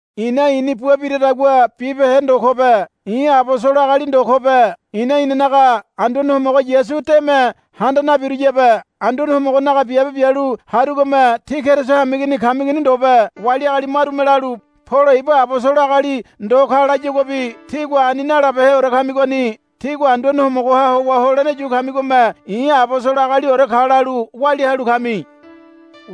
I̱na i̱ni bua biradagua bibehe ndo kobe. I̱ abosolo agali ndo kobe. I̱na inanaga Anduane Homogo Yasu deme handa nabiruyabe. Anduane Homogonaga biabe bialu harugome tí Keriso hameigini kamigoni ndobe. Wali agali marume lalu, Polo ibu abosolo agali ndo ka, layaguabi tígua ani nalabeheore kamigoni. Tígua Anduane Homogoha howa holene yu kamigome i̱ abosolo agaliore ka lalu walia halu kami.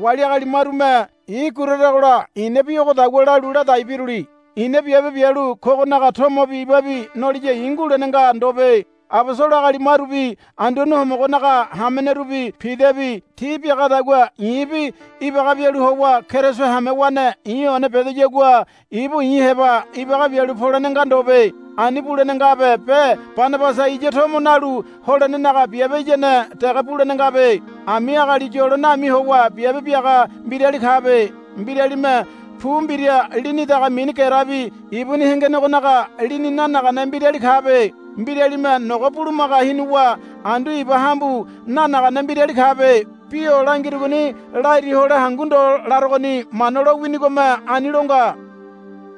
Wali agali marume i̱ guraragola i̱na bi ogodagua lalu ladai biruli. I̱na biabe bialu kogonaga tomobi ibabi noliya i̱ ngulene nga ndobe. Abosolo agali marubi Anduane Homogonaga hamenerubi Pidabi ti biagadagua i̱bi ibaga bialu howa Keriso hamewane i̱ one bedoyagua ibu i̱ heba ibaga bialu polene nga ndobe. Ani bulene ngabe be Banabasa iya tomo nalu holenenaga biabe iyane dege bulene ngabe. Ami agali yolo nami howa biabe biaga mbirali kabe. Mbiralime pu mbira lini daga mini gerebi ibuni hengenegonaga lini nanagane mbirali kabe. Mbiralime nogo bulumaga hinuwa andu iba hambu nanagane mbirali kabe. Bi o langirugoni lairi hole hangu ndo larogoni. Mana lo winigome ani lo nga.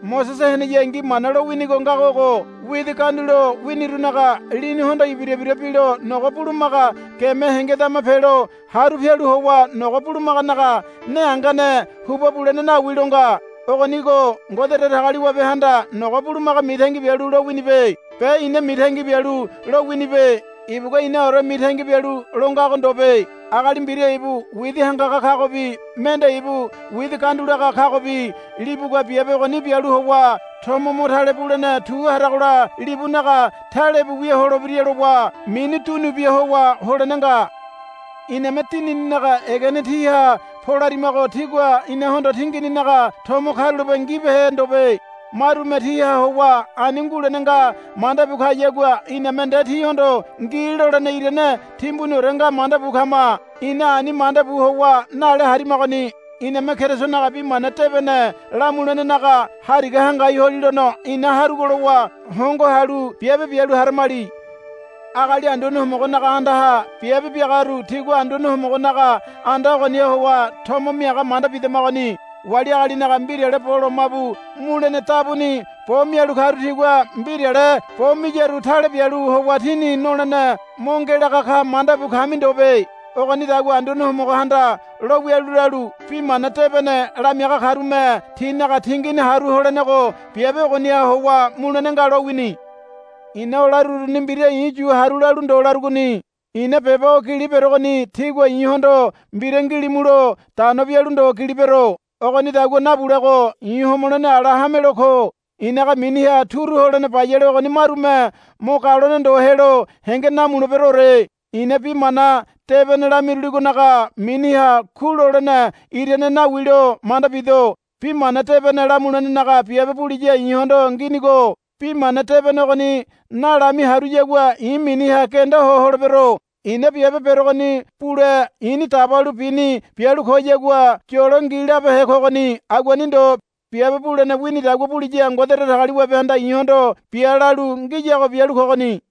Mosese heneyangi Mana lowini ngago ogo, Widi gandulo winirunaga lini hondo ibira ibira bilo nogo bulumaga geme hengedama pelo haru pialu howa nogo bulumaganaga ne hangane hubua bulene nawi, lo nga. Ogonigo Ngode Datagaliwabehanda nogo bulumaga mitangi bialu lo winibe be ina mitangi bialu lo winibe. Ibugua inaore mitangi bialu lo ngago ndobe. Agali mbira ibu widi hangaga kagobi mende ibu widi gandulaga kagobi libugua biabe ogoni bialu howa tomo mo tale bulene tu haragola libunaga talebu wia holebira lowa mini dunu bia howa holene nga. Iname dinininaga egene tíha polarimago tígua inahondo tingininaga tomo karulape ngibehe ndobe. Marume tíha howa ani ngulene nga manda bu kayagua iname nde tíhondo, Ngi, lolene irane timbuniore nga manda bu kama. Ina ani manda bu howa nale harimagoni. Iname Kerisonaga Bi Mana Debene lamulenenaga hariga hangai holilono ina harugo lowa hongo halu biabe bialu haramali. Agali Anduane Homogonaga andaha biabe biagaru tigua Anduane Homogonaga anda ogoniha howa tomo miaga manda bidamigoni. Wali agalinaga mbirale bo lomabu mulene dabuni bo mialu karu tigua mbirale bo miyaru tale bialu howa tini nolene mo ngelaga ka manda bu kami ndobe. Ogonidagua Anduane Homogohanda lo wialu lalu, Bi mana debene lamiaga karume tinaga tingini haru holenego biabe ogoniha howa mulene nga, lowini. I̱na o laruruni mbira i̱ yu haru lalu ndo larugoni. I̱na beba o gili berogoni tígua i̱hondo mbira ngilimulo dano bialu ndo gili bero. Ogonidagua nabulego i̱ homolene ala hamelo ko. I̱naga miniha turu holene bayale ogoni marume mo galone ndo helo henge namuleberoore. I̱na bi mana debene lamiruligonaga miniha ku lolene irane nawi lo manda bido. Bi mana debene lamulenenaga biabe buliya i̱hondo nginigo. Bi mana debene ogoni nalami haruyagua i̱ miniha genda ho holebero. I̱na biabe berogoni bule i̱ni dabalu bini bialu koyagua yolo ngi labehe kogoni. Aguani ndo. Biabe bulene winidagua buliya Ngode Datagaliwabehanda i̱hondo, Bia, lalu ngiyago bialu kogoni.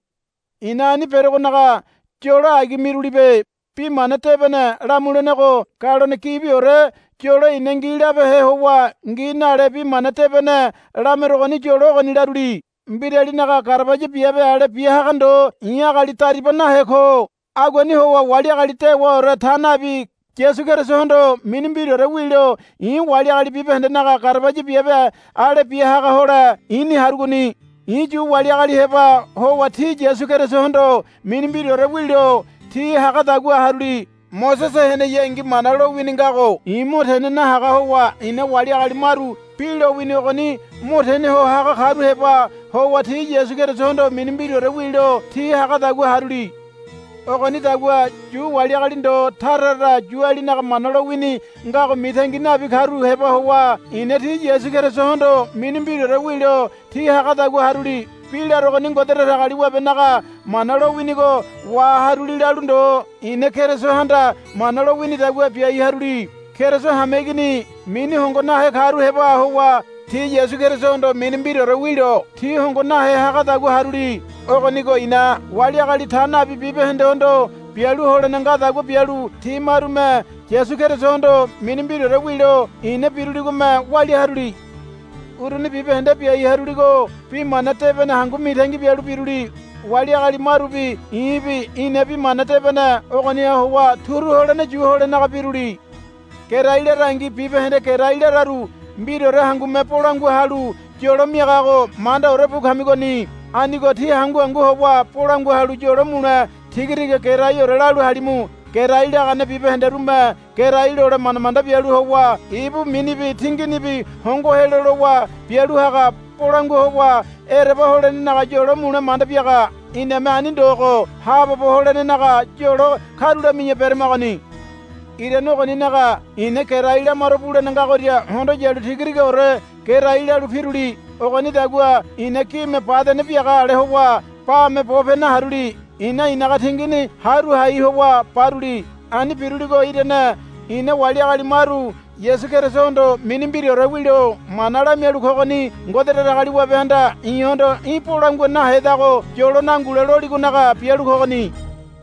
I̱na ani berogonaga yolo agi mirulibe. Bi Mana Debene lamulenego galone gibiore yolo i̱na ngi labehe howa ngi nale bi mana debene lamerogoni yolo ogoni laruli. Mbiralinaga garabaya biabe ale bia haga ndo i̱ agali dariba nahe ko. Aguani howa wali agali dewaore ta nabi Yasu Kerisohondo mini mbiraore wilo i̱ wali agali bibahendenaga garabaya biabe ale bia haga hole i̱ni harogoni. I̱ Yu wali agali heba howa ti Yasu Kerisohondo mini mbiraore wilo ti hagadagua haruli. Mosese heneyangi Mana lowini ngago i̱ mo tene nahaga howa i̱na wali agali maru bi lowini ogoni mo tene ho haga karu heba howa ti Yasu Kerisohondo mini mbiraore wilo ti hagadagua haruli. Ogonidagua Yu wali agali ndo tara tara Yualinaga Mana lowini ngago mitangi nabi karu heba howa i̱na ti Yasu Kerisohondo mini mbiraore wilo ti hagadagua haruli. Bi larogoni Ngode Datagaliwabenaga mana lo winigo waharuli lalu ndo i̱na Kerisohanda mana lo winidagua biai haruli. Keriso hameigini mini hongo nahe karu heba howa ti Yasu Kerisohondo mini mbiraore wilo ti hongo nahe hagadagua haruli. Ogonigo i̱na wali agali ta nabi bibahendehondo bialu holene ngadagua bialu ti marume Yasu Kerisohondo mini mbiraore wilo i̱na biruligome walia haruli. Uruni bibahende biai haruligo bi mana debene hangu mitangi bialu biruli. Wali agali marubi i̱bi ina bi mana debene ogoniha howa turu holene yu holenaga biruli. Gerai larangi bibahende gerai lararu mbiraore hangume bolangua halu yolo miagago mandaore bu kamigoni. Anigo tí hangu hangu howa bolangua halu yolo mule tigatiga geraiore lalu halimu. Gerai lagane bibahenderume gerai lole manda manda bialu howa ibu minibi tinginibi hongo helo lowa bialu haga. Bolangua howa ereba holenenaga yolo mule manda biaga. Iname ani ndogo haabobo holenenaga yolo karulami̱ya beramagoni. Irane ogoninaga i̱na gerai lamaro bulene ngagoria hondo yalu tigatigaore gerai lalu piruli. Ogonidagua i̱na gime badene biaga ale howa bame bope naharuli. I̱na i̱naga tingini haru hai howa baruli. Ani biruligo irane i̱na wali agali maru Yasu Kerisohondo mini mbiraore wilo mana lamialu kogoni Ngode Datagaliwabehanda i̱hondo, Í̠ bolangua nahedago yolo nangule, loligonaga bialu kogoni.